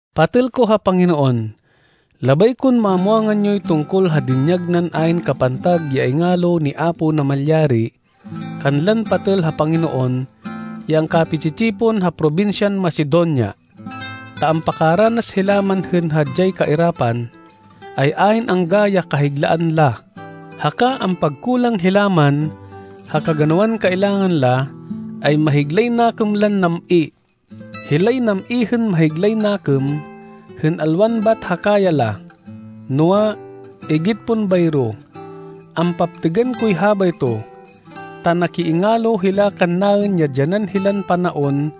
Patêl ko ha Panginoon, labay kon mamwangan yoy tungkol ha dinyag nan ayn kapantag ya ingalo ni Apo Namalyari kanlan patêl ha Panginoon ya angkapi-tsi-tsipon ha probinsyan Macedonia. Ta ampakaranas hila man hên hadyay kairapan, ay ayn angga ya kahiglaan la, haka ampagkulang hila man ha kaganawan kailangan la, ay mahiglay nakêm lan nam-i. Hilay nam-i hên mahiglay nakêm, hên alwan bat ha kaya la, noa, igit pon bayro. Ampaptêgan koy habayto, ta nakiingalo hila kannaên ya dyanan hilan panaon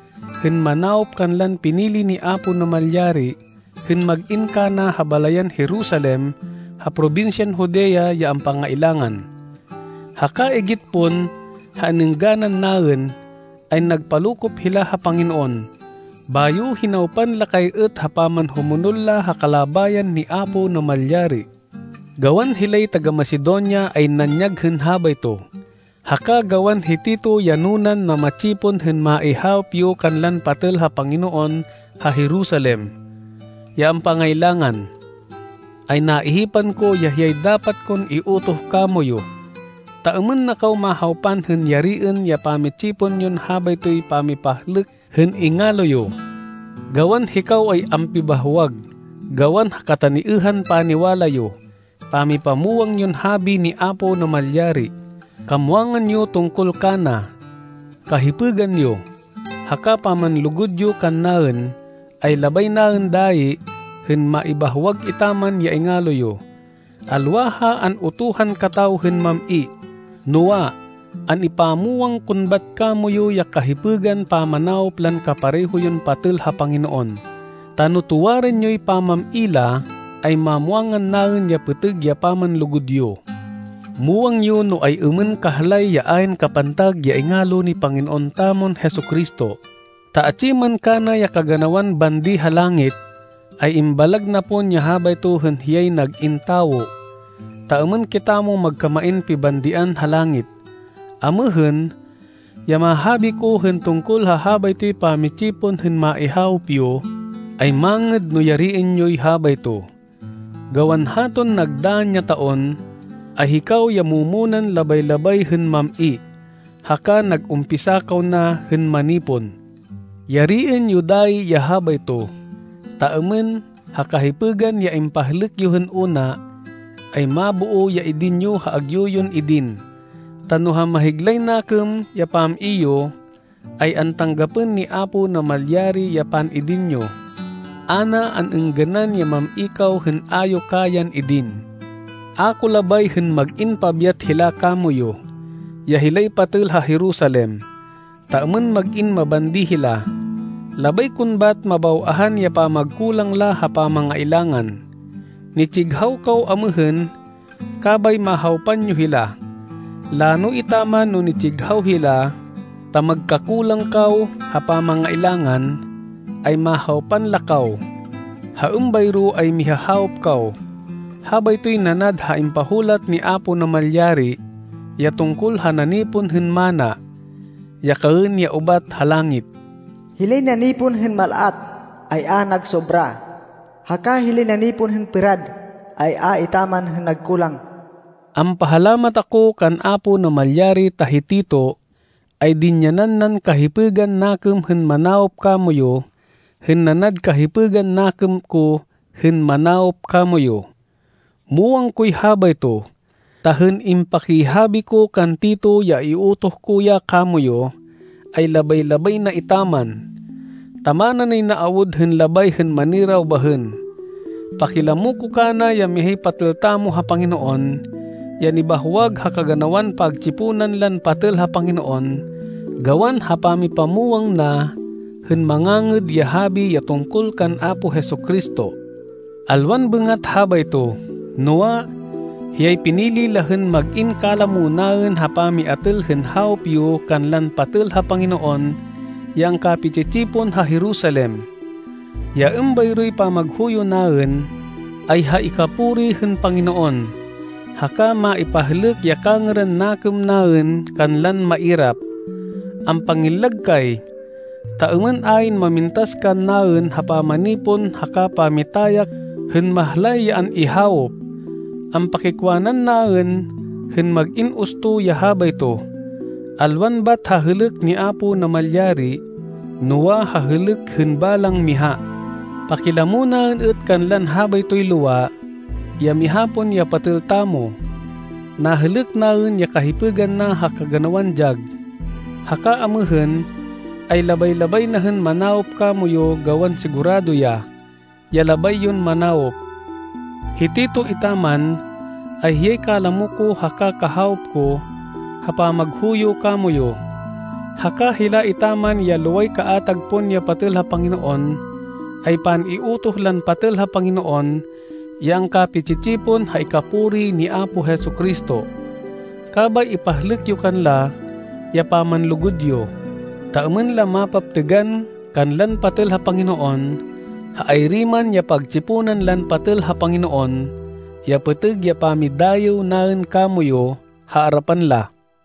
hên manawop kanlan pinili ni Apo Namalyari hên mag-in kana ha balayan Jerusalem ha probinsyan Judea ya ampangailangan. Haka igit pon ha an-êngganan naên, ay nagpalokop hila ha Panginoon, bayo hinawpan la kay êt ha pamanhumonol la ha kalabayan ni Apo Namalyari. Gawan hilay taga-Macedonia ay nanyag hên habayto, haka gawan hi Tito ya nunan nama-tsipon hên maihawop yo kanlan patêl ha Panginoon ha Jerusalem, ya ampangailangan, ay naihipan ko ya hiyay dapat kon iutoh kamoyu, ta êmên na kaw mahawpan hên yariên ya pamitsipon yon habaytoy pamipahlêk hên ingalo yo. Gawan hikaw ay ampibahwag gawan ha kataniêhan paniwala yo, pamipamwang yon habi ni Apo Namalyari, kamwangan yo tungkol kana, kahipêgan yo, haka pamanlugud yo kannaên, ay labay naên dayi hên maibahwag etaman ya ingalo yo. Alwa ha an-utuhan kataw hên mam-i, noa, an-ipamwang kon bat kamoyu ya kahipêgan pamanawop lan kapareho yon patêl ha Panginoon, ta no tuwarên yoy pamam-i la, ay mamwangan naên ya pêtêg ya pamanlugud yo. Muwang yo no ay-êmên kahlay ya ayn kapantag ya ingalo ni Panginoon tamon Jesu-Cristo, ta atsi man kana ya kaganawan bandi ha langit, ay imbalag na pon ya habayto hên hiyay nag-in tawo, ta êmên kitamo magkamain pibandian ha langit. Amêhên, ya mahabi ko hên tungkol ha habaytoy pamitsipon hên maihawop yo, ay mangêd no yariên yoy habayto, gawan haton nagdann ya taon, ay hikaw ya mu-munan labay-labay hên mam-i, haka nag-umpisa kaw na hên manipon. Yariên yo dayi ya habayto, ta êmên ha kahipêgan ya impahlêk yo hên una, ay maboo ya idin yo ha agyu yon idin. Ta no ha mahiglay nakêm ya pam-i yo, ay antanggapên ni Apo Namalyari ya pan-idin yo. A na an-êngganan ya mam-i kaw hên a yo kayan idin. A ko labay hên mag-in pabyat hila kamoyu, ya hilay patêl ha Jerusalem, ta êmên mag-in mabandi hila. Labay kon bat mabaw-ahan ya pamagkulang la ha pamangailangan. Nitsighaw kaw amêhên, kabay mahawpan yo hila. Lano etaman no nitsighaw hila, ta magkakulang kaw ha pamangailangan, ay mahawpan la kaw. Ha êmbayro ay mihahawop kaw. Habaytoy nanad ha impahulat ni Apo Namalyari, ya tungkol ha nanipon hên manna, ya kaên ya ubat ha langit, “Hilay nanipon hên mal-at, ay a nagsobra, haka hilay nanipon hên pêrad, ay a etaman hên nagkulang.” Ampahalamat ako kan Apo Namalyari ta hi Tito, ay dinyanan nan kahipêgan nakêm hên manawop kamoyu hên nanad kahipêgan nakêm ko hên manawop kamoyu. Muwang koy habayto, ta hên impakihabi ko kan Tito ya iutoh ko ya kamoyu, ay labay-labay na etaman, ta mana nay na awud hên labay hên maniraw bahên. Pakilamo ko kana ya mihay patêl tamo ha Panginoon, ya nibahwag ha kaganawan pagtsiponan lan patêl ha Panginoon, gawan ha pamipamwang na hên Mangangêd ya Habi ya tungkol kan Apo Jesu-Cristo. Alwan bêngat habayto, noa, hiyay pinili la hên mag-in kalamo naên ha pamiatêl hên hawop yo kanlan patêl ha Panginoon ya angkapi-tsi-tsipon ha Jerusalem. Ya êmbayroy pamaghuyo naên, ay ha ikapuri hên Panginoon, haka maipahlêk ya kangêran nakêm naên kanlan mairap. Ampangillag kay, ta êmên ayn mamintas kannaên ha pamanipon haka pamitayak hên mahlay ya an-ihawop. Ampakikwanan naên hên mag-in usto ya habayto, alwan bat ha hêlêk ni Apo Namalyari noa, ha hêlêk hên balang miha. Pakilamo naên êt kanlan habaytoy lowa, ya miha pon ya patêl tamo. Nahêlêk naên ya kahipêgan na ha kaganawan dyag. Haka amêhên, ay labay-labay na hên manawop kamoyu gawan sigurado ya, ya labay yon manawop. Hi Tito etaman, ay hiyay kalamo ko haka kahawop ko ha pamaghuyo kamoyu. Haka hila etaman ya loway kaatag pon ya patêl ha Panginoon, ay pan-iutoh lan patêl ha Panginoon ya angkapi-tsi-tsipon ha ikapuri ni Apo Jesu-Cristo. Kabay ipahlêk yo kanla ya pamanlugud yo, ta êmên la mapaptêgan kanlan patêl ha Panginoon ha ayri man ya pagtsiponan lan patêl ha Panginoon, ya pêtêg ya pamidayêw naên kamoyu ha arapan la.